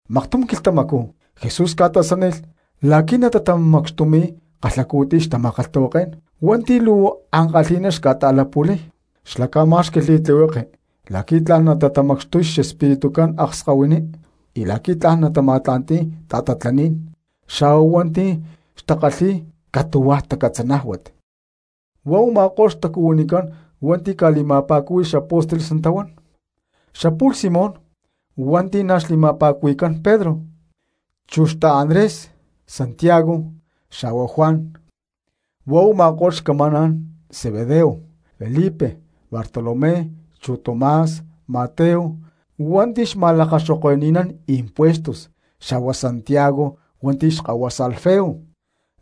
Maktum quilhtamacú Jesús ca̠tasánilh la̠qui̠ natatamacxtumi̠y kalhacu̠tiy xtama̠kalhtahuaké̠n hua̠nti̠ luu ankalhi̠ná xca̠ta̠latapu̠lqai̠y. Xlá ca̠má̠xqui̠lh li̠tlihueke la̠qui̠ tla̠n natatamacxtuy xespiritucán akskahuiní y la̠qui̠ tla̠n natama̠tla̠nti̠y ta̠tatlaní̠n xa̠huá hua̠nti̠ xca̠kalhi̠y catu̠huaj tacatzanájuat. Huá u̠ma̠ko̠lh xtacuhuinicán hua̠nti̠ ca̠li̠ma̠pa̠cúhui̠lh xapóstoles natahuán: Xapu̠lh Simón hua̠nti̠ na̠ xli̠ma̠pa̠cuhui̠cán Pedro, chu xta̠Andrés; Santiago xa̠hua Juan, huá u̠ma̠ko̠lh xcamaná̠n Zebedeo; Felipe, Bartolomé chu Tomás; Mateo hua̠nti̠ xma̠lakaxoke̠nán impuestos, xa̠huá Santiago hua̠nti̠ xkahuasa Alfeo;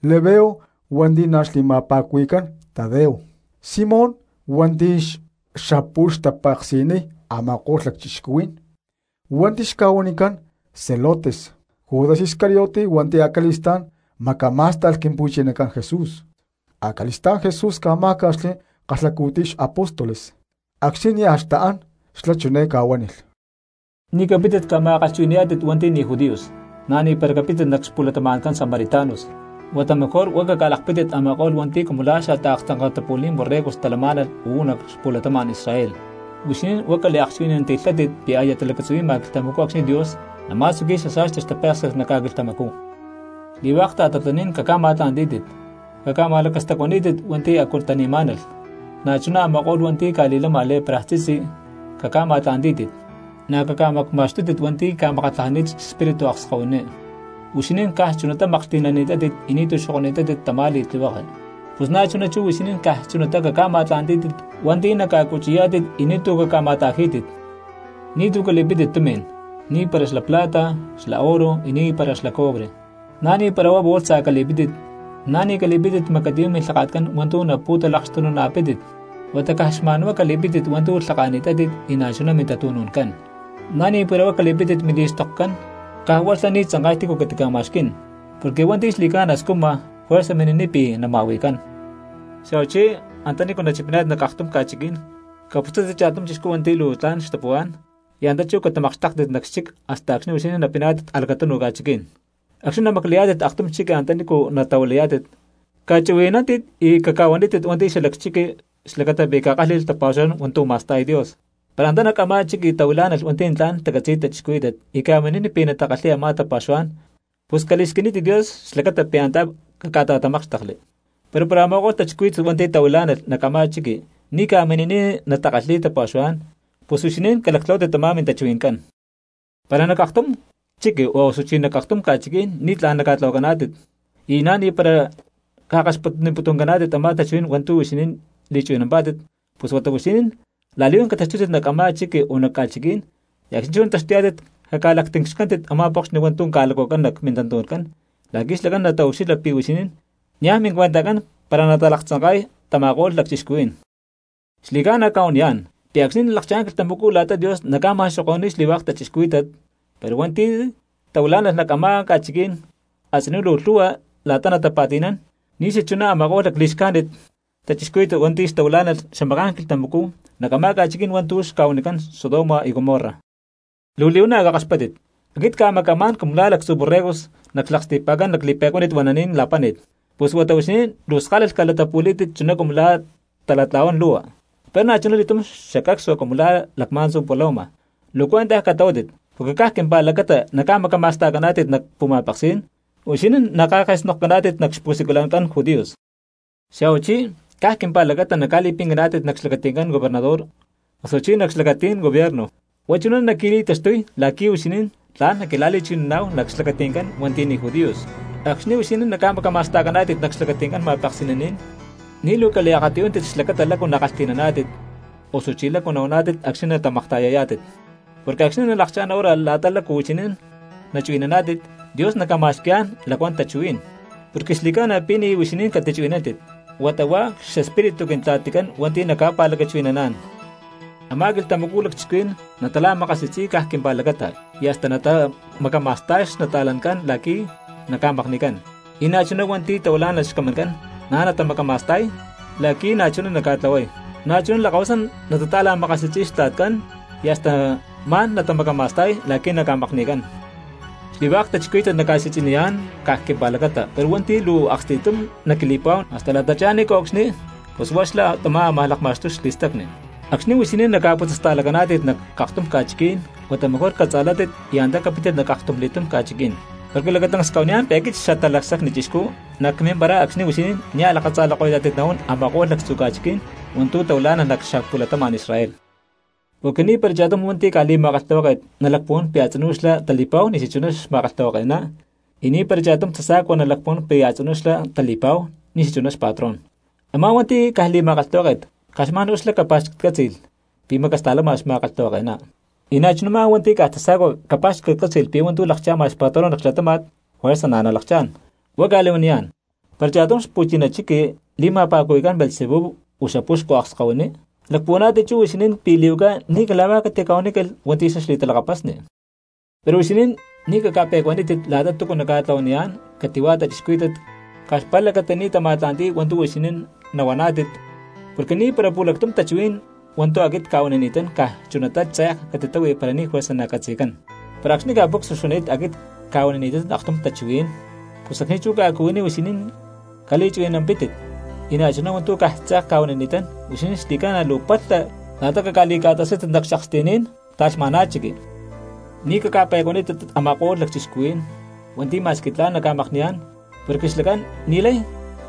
Labeo hua̠nti̠ na̠ xli̠ma̠pa̠cuhui̠cán Tadeo; Simón hua̠nti̠ xapu̠lh xca̠ta̠tapeksi̠y a̠ma̠ko̠lh lacchixcuhuí̠n hua̠nti̠ xca̠huanicán celotes; Judas Iscariote hua̠nti̠ acali̠stá̠n macamá̠sta̠lh Quimpu̠chinacán Jesús. Acali̠stá̠n Jesús ca̠má̠ca̠xli kalhacu̠tiy xapóstoles; acxni̠ nia̠ xtaán xlá chiné ca̠huánilh: —Ni̠ capítit ca̠ma̠kalhchuhui̠ni̠yá̠tit hua̠nti̠ ni̠ judíos, na̠ni̠para capítit nac xpu̠latama̠ncán samaritanos. Huata mejor huá caca̠lakpítit a̠ma̠ko̠lh hua̠nti̠ cumu lá xataaktzanka̠tapu̠lí̠n borregos talamá̠nalh uú nac xapu̠latama̠n Israel. Huixinín huá caliakchuhui̠nanti̠lhátit pi̠ aya talacatzuhui̠ma quilhtamacú acxni̠ Dios nama̠tzuqui̠y xasa̠sti xtapéksi̠t nac ca̠quilhtamacú. Xli̠hua̠k ta̠tatlaní̠n caca̠ma̠tla̠ntí̠tit, caca̠ma̠lakastacuaní̠tit hua̠nti̠ a̠cu tani̠má̠nalh cristianos, na̠chuná a̠ma̠ko̠lh hua̠nti̠ ca̠li̠lama lepraj tzitzi caca̠ma̠tla̠ntí̠tit, na̠ caca̠macma̠xtútit hua̠nti̠ ca̠makatlajani̠t xespíritu akskahuiní. Huixinín caj chunatá maklhti̠nani̠tátit y ni̠tu̠ xokoni̠tátit tamá li̠tlihueke, pus na̠chuná chú huixinín caj chunatá caca̠ma̠tla̠ntí̠tit hua̠nti̠ naca̠cuchi̠yá̠tit y ni̠tu̠ caca̠ma̠ta̠jí̠tit. ’Ni̠túcu cali̠pítit tumi̠n, ni̠para xla plata, xla oro y na̠ ni̠para xla cobre. Na̠ ni̠para huá bolsa cali̠pítit, na̠ ni̠ cali̠pítit macatiyú̠n milhaka̠tcán hua̠ntu̠ napu̠talakxtununa̠pítit, huata caj xma̠n huá cali̠pítit hua̠ntu̠ lhaka̠ni̠tátit y na̠chuná mintatu̠nu̠ncán. Na̠ ni̠para huá cali̠pítit mili̠xtokcán, caj huá xlá ni̠ tzanka̠y tícu catica̠ma̠xquí̠n; porque hua̠nti̠ xli̠ca̠na scujma juerza mini̠niy pi̠ nama̠hui̠cán. ’Xa̠huachi antanícu nachipiná̠tit nac aktum ca̠chiquí̠n caputzátit cha̠tum chixcú hua̠nti̠ luu tla̠n xtapuhuá̠n y antá chú catamakxtéktit nac xchic hasta acxni̠ huixinín napiná̠tit a̠lacatunuj ca̠chiquí̠n. Acxni̠ namaclayá̠tit aktum chiqui antanícu natahuilayá̠tit, cachuhui̠nántit y caca̠huanítit hua̠nti̠ xalac chiqui xlacata pi̠ catakálhi̠lh tapa̠xuhuá̠n hua̠ntu̠ ma̠sta̠y Dios. Para antá nac a̠má chiqui tahuilá̠nalh hua̠nti̠ tla̠n tacatzi̠y cristianos y ca̠mini̠niy pi̠ natakalhi̠y a̠má tapa̠xuhuá̠n, pus cali̠squinítit Dios xlacata pi̠ antá caca̠ta̠tamákxtekli. Pero para a̠ma̠ko̠lh cristianos hua̠nti̠ tahuilá̠nalh nac a̠má chiqui ni̠ ca̠mini̠niy natakalhi̠y tapa̠xuhuá̠n, pus huixinín calactlahuátit tamá mintachuhui̠ncán. Para nac aktum chiqui osuchí nac aktum ca̠chiquí̠n ni̠tlá̠n naca̠tlahuacaná̠tit y na̠ ni̠para ca̠kaxpatniputuncaná̠tit a̠má tachuhuí̠n hua̠ntu̠ huixinín li̠chuhui̠nampá̠tit, pus huata huixinín la̠li̠huán cataxtútit nac a̠má chiqui o nac ca̠chiquí̠n, y acxni̠ nataxtuyá̠tit caca̠lactincxcántit a̠má pokxni hua̠ntu̠ ca̠lactahuacán nac mintantu̠ncán la̠qui̠ xlacán nataucxilha pi̠ huixinín niaj mincuentajcán para natalaktzanka̠y tama̠ko̠lh lacchixcuhuí̠n. Xli̠ca̠na cca̠huaniyá̠n pi̠ acxni̠ nalakchá̠n quilhtamacú la̠ta Dios naca̠ma̠xoko̠ni̠y xli̠hua̠k cristianos, pero hua̠nti̠ tahuilá̠nalh nac a̠má ca̠chiquí̠n a̠tzinú luu lhu̠hua la̠ta natapa̠ti̠nán ni̠xachuná a̠ma̠ko̠lh lacli̠xcájnit cristianos hua̠nti̠ xtahuilá̠nalh xamaká̠n quilhtamacú nac a̠ma̠ko̠lh ca̠chiquí̠n hua̠ntu̠ xca̠huanicán Sodoma y Gomorra. ’¡Luu li̠huana̠ cakaxpátit! Aquit cca̠maca̠má̠n cumu lá lactzu borregos nac xlaksti̠pa̠ncán lacli̠pe̠cuánit huananí̠n la̠páni̠t. Pus huata huixinín luu skalalh calatapu̠lí̠tit chuná cumu la̠ talatla̠huán lu̠hua, pero na̠chuna li̠túm xacacsua cumu lá lacma̠ntzu paloma. Luu cuentaj catlahuátit porque caj quimpa̠lacata naca̠macama̠sta̠caná̠tit nac pu̠ma̠peksí̠n, huixinín naca̠ke̠snokcaná̠tit nac xpu̠siculancán judíos. Xa̠huachí caj quimpa̠lacata naca̠li̠pincaná̠tit nac xlacati̠ncán gobernador osuchí nac xlacatí̠n gobierno. Huá chuná naqui̠li̠taxtuy la̠qui̠ huixinín tla̠n naquila̠li̠chuhui̠naná̠hu nac xlacati̠ncán hua̠nti̠ ni̠ judíos. Acxni̠ huixinín naca̠macama̠sta̠caná̠tit nac xlacati̠ncán ma̠peksi̠naní̠n ni̠ luu caliakatiyúntit xlacata lácu nakalhti̠naná̠tit osuchi lácu nahuaná̠tit acxni̠ natamakta̠yayá̠tit. Porque acxni̠ nalakchá̠n hora la̠ta lácu huixinín nachuhui̠naná̠tit, Dios naca̠ma̠xqui̠yá̠n lacuán tachuhuí̠n. Porque xli̠ca̠na pi̠ ni̠ huixinín catichuhui̠nántit, huata huá xespíritu Quintla̠ticán hua̠nti̠ naca̠pa̠lacachuhui̠naná̠n. ’Amá quilhtamacú lacchixcuhuí̠n natala̠makasi̠tzi̠y caj quimpa̠lacata, y hasta natamacama̠sta̠y xnata̠lancán la̠qui̠ naca̠makni̠cán; y na̠chuná hua̠nti̠ tahuilá̠nalh xcamancán na̠ natamacama̠sta̠y la̠qui̠ na̠chuná naca̠tlahuay; na̠chuná lakahuasán natata̠la̠makasi̠tzi̠y xtla̠tcán y hasta ma̠n natamacama̠sta̠y la̠qui̠ naca̠makni̠cán. Xli̠hua̠k cristianos naca̠si̠tzi̠niyá̠n caj quimpa̠lacata, pero hua̠nti̠ luu aksti̠tum naquili̠pa̠huán hasta la̠tachá ni̠nco̠cxni pus huá xlá tamá amaj lakma̠xtuy xli̠stacni. Acxni̠ huixinín naca̠putzasta̠lacaná̠tit nac aktum ca̠chiquí̠n huata mejor catza̠látit y antá capítit nac aktumli̠túm ca̠chiquí̠n. Porque lacatancs cca̠huaniyá̠n pi̠ aquit Xatalacsacni Chixcú nacmimparay acxni̠ huixinín nia̠ lakatza̠lako̠yá̠tit nahuán a̠ma̠ko̠lh lactzu ca̠chiqui̠ní̠n hua̠ntu̠ tahuilá̠nalh nac xapu̠latama̠n Israel. ’Porque ni̠para cha̠tum hua̠nti̠ caj li̠ma̠kalhtahuáke̠t nalacpuhuán pi̠ a̠tzinú xlá tali̠pa̠hu ni̠ xachuná xma̠kalhtahuake̠ná, y ni̠para cha̠tum tasa̠cua nalacpuhuán pi̠ a̠tzinú xlá tali̠pa̠hu ni̠xachuná xpatrón. Amá hua̠nti̠ caj li̠ma̠kalhtahuáke̠t caj xma̠n huá xlá capa̠xcatcátzi̠lh pi̠ macasta̠lama xma̠kalhtahuake̠ná, y na̠chuná a̠má hua̠nti̠ caj tasa̠cua capa̠xcatcátzi̠lh pi̠ hua̠ntu̠ lakcha̠ma xpatrón nac xlatáma̠t juerza na̠ nalakchá̠n. Huá cca̠li̠huaniyá̠n, para cha̠tum xpu̠china chiqui li̠ma̠pa̠cuhui̠cán Beelzebú o xapuxcu akskahuiní, ¿lacpuhuaná̠tit chú huixinín pi̠ li̠huaca ni̠ cala̠huá catica̠huanícalh hua̠nti̠ xlá xli̠talakapasni? ’Pero huixinín ni̠ caca̠pe̠cuanítit la̠ta túcu naca̠tlahuaniyá̠n cati̠hua cristianos caj xpa̠lacata ni̠ natama̠tla̠nti̠y hua̠ntu̠ huixinín nahuaná̠tit, porque ni̠para pu̠lactum tachuhuí̠n hua̠ntu̠ aquit cca̠huanini̠tán caj chunatá tze̠k catitáhui para ni̠ juerza nacatzi̠cán. Para acxni̠ ca̠pucsua xuani̠t aquit cca̠huanini̠tán aktum tachuhuí̠n, pus acxni̠ chú ca̠cuhuiní huixinín caliakchuhui̠nampítit; y na̠chuná hua̠ntu̠ caj tze̠k cca̠huanini̠tán, huixinín xli̠ca̠na luu palha la̠ta cali̠ca̠tasátit nac xca̠aksti̠ní̠n ta̠lhma̠ná chiqui. Ni̠ caca̠pe̠cuanítit a̠ma̠ko̠lh lacchixcuhuí̠n hua̠nti̠ ma̠squi tla̠n naca̠makni̠yá̠n porque xlacán ni̠lay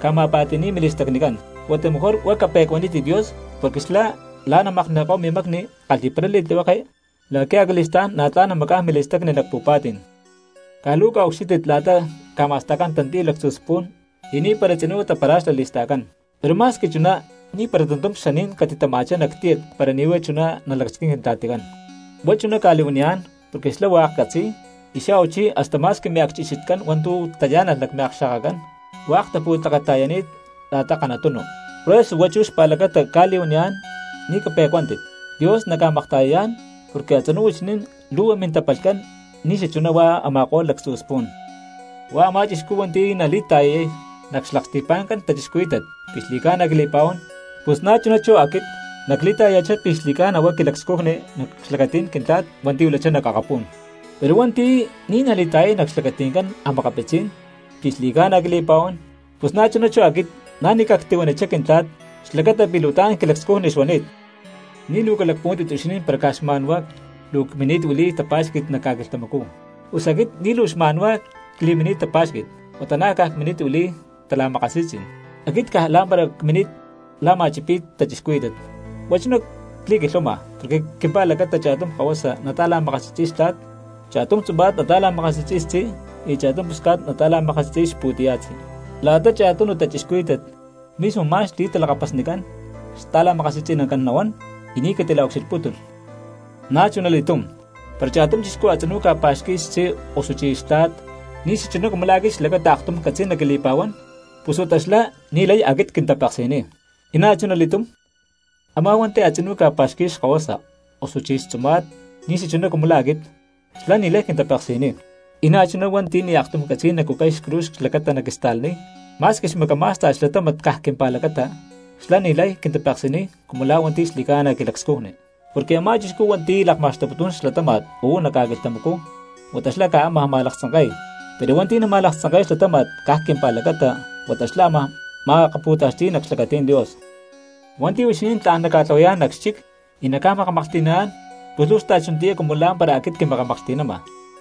ca̠ma̠pa̠ti̠ni̠y mili̠stacnicán. Huata mejor huá cape̠cuanítit Dios porque xlá la̠ namakni̠ko̠y mimacni kalhi̠paray li̠tlihueke la̠qui̠ acali̠stá̠n na̠ tla̠n namacá̠n mili̠stacni nac pu̠pa̠tí̠n. ’Caj luu caca̠ucxílhtit la̠ta ca̠ma̠sta̠cán tantiy lactzu spu̠n y ni̠para tzinú tapara̠xalá li̠sta̠cán, pero ma̠squi chuná ni̠para tantum xaní̠n catitama̠chá nac tíyat para ni̠ huá chuná nalacasquín Quintla̠ticán. Huá chuná cca̠li̠huanimá̠n porque xlá hua̠k catzi̠y, y xa̠huachí hasta ma̠squi miacchixitcán hua̠ntu̠ tayá̠nalh nac miakxa̠kacán hua̠k tapu̠tleketa̠yani̠t la̠ta kanatunu. Por eso huá chú xpa̠lacata cca̠li̠huaniyá̠n ni̠ cape̠cuántit, Dios naca̠makta̠yayá̠n porque a̠tzinú huixinín lhu̠hua mintapalhcán ni̠xachuná hua̠k a̠ma̠ko̠lh lactzu spu̠n. ’Huá a̠má chixcú hua̠nti̠ nali̠ta̠yay nac xlaksti̠pa̠ncán cristianos pi̠ xli̠ca̠na quili̠pa̠huán pus na̠chuná chú aquit na̠ nacli̠ta̠yaya̠chá pi̠ xli̠ca̠na huá quilacscujni nac xlacatí̠n Quintla̠t hua̠nti̠ huilachá nac akapú̠n. Pero hua̠nti̠ ni̠ nali̠ta̠yay nac xlacati̠ncán cristianos pi̠ xli̠ca̠na quili̠pa̠huán pus na̠chuná chú aquit na̠ ni̠ cactihuanichá Quintla̠t xlacata pi̠ luu tla̠n quilacscujni xuani̠t. ’Ni̠ luu calacpuhuántit huixinín para caj xma̠nhuá luu cmini̠t huili̠y tapa̠xqui̠t nac ca̠quilhtamacú, pus aquit ni̠ luu xma̠nhuá cli̠mini̠t tapa̠xqui̠t huata na̠ caj cmini̠t huili̠y tala̠makasi̠tzí̠n. Aquit caj la̠mpara cmini̠t la̠ma̠chipi̠y cristianos, huá chuná cli̠quilhuama porque caj quimpa̠lacata cha̠tum kahuasa nata̠la̠makasi̠tzi̠y xtla̠t, cha̠tum tzuma̠t nata̠la̠makasi̠tzi̠y xtzí, y cha̠tum pusca̠t nata̠la̠makasi̠tzi̠y xpu̠tiya̠tzí. La̠ta cha̠tunu cristianos mismo ma̠n xli̠talakapasnicán xta̠la̠makasi̠tzi̠nacán nahuán y ni̠ catila̠ucxilhpútulh. ’Na̠chunali̠tum, para cha̠tum chixcú a̠tzinú ca̠pa̠xqui̠y xtzí osuchí xtla̠t ni̠xachuná cumu la̠ aquit xlacata aktum catzi̠y naquili̠pa̠huán, pus huata xlá ni̠lay aquit quintapeksi̠niy; y na̠chuna li̠túm a̠má hua̠nti̠ a̠tzinú pa̠xqui̠y xkahuasa osuchí xtzuma̠t ni̠xachuná cumu la̠ aquit, xlá ni̠lay quintapeksi̠niy. Y na̠chuná hua̠nti̠ ni̠ aktum catzi̠y nacucay xcruz xlacata naquista̠laniy ma̠squi xmacamá̠sta̠lh xlatáma̠t caj quimpa̠lacata, xlá ni̠lay quintapeksi̠niy cumu la̠ hua̠nti̠ xli̠ca̠na quilacscujni. Porque a̠má chixcú hua̠nti̠ lakma̠xtuputún xlatáma̠t uú nac ca̠quilhtamacú huata xlá amaj ma̠laktzanke̠y, pero hua̠nti̠ nama̠laktzanke̠y xlatáma̠t caj quimpa̠lacata huata xlá amaj ma̠akapu̠taxti̠y nac xlacatí̠n Dios. ’Hua̠nti̠ huixinín tla̠n naca̠tlahuayá̠n nac xchic y naca̠makamaklhti̠naná̠n pus luu xta̠chunatiyá cumu la̠mpara aquit quimakamaklhti̠nama;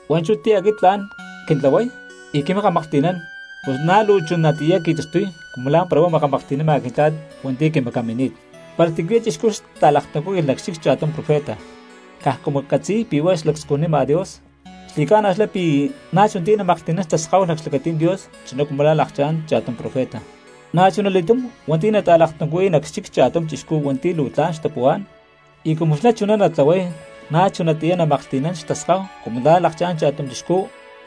hua̠nchú ti̠ aquit tla̠n quintlahuay y quimakamaklhti̠nán pus na̠ luu chunatiyá qui̠taxtuy cumu la̠mpara huá makamaklhti̠nama Quintla̠t hua̠nti̠ quimacamini̠t. Para tícuya̠ chixcú xta̠laktuncúhui̠lh nac xchic cha̠tum profeta caj cumu catzi̠y pi̠ huá lacscujnima Dios, xli̠ca̠na xlá pi̠ na̠ chunatiyá namaklhti̠nán xtaskáhu nac xlacatí̠n Dios chuná cumu la̠ lakchá̠n cha̠tum profeta. Na̠chunali̠túm hua̠nti̠ nata̠laktuncuhui̠y nac xchic cha̠tum chixcú hua̠nti̠ luu tla̠n xtapuhuá̠n, y cumu xlá chuná natlahuay na̠chunatiyá namaklhti̠nán xtaskáhu cumu la̠ lakchá̠n cha̠tum chixcú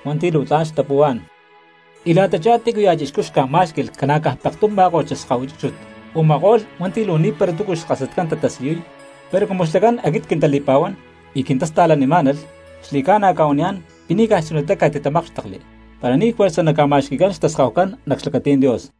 hua̠nti̠ luu tla̠n xtapuhuá̠n. Y la̠tachá tícuya̠ cristiano xca̠má̠xqui̠lh ca̠na̠caj pektum má̠ko̠t xaskahuihui chúchut u̠ma̠ko̠lh hua̠nti̠ luu ni̠para túcu xkasatcán tatasiyuy, pero cumu xlacán aquit quintali̠pa̠huán y quintasta̠lanimá̠nalh, xli̠ca̠na cca̠huaniyá̠n pi̠ ni̠ caj chunatá catitatamákxtekli para ni̠ juerza naca̠ma̠xqui̠cán xtaskahucán nac xlacatí̠n Dios.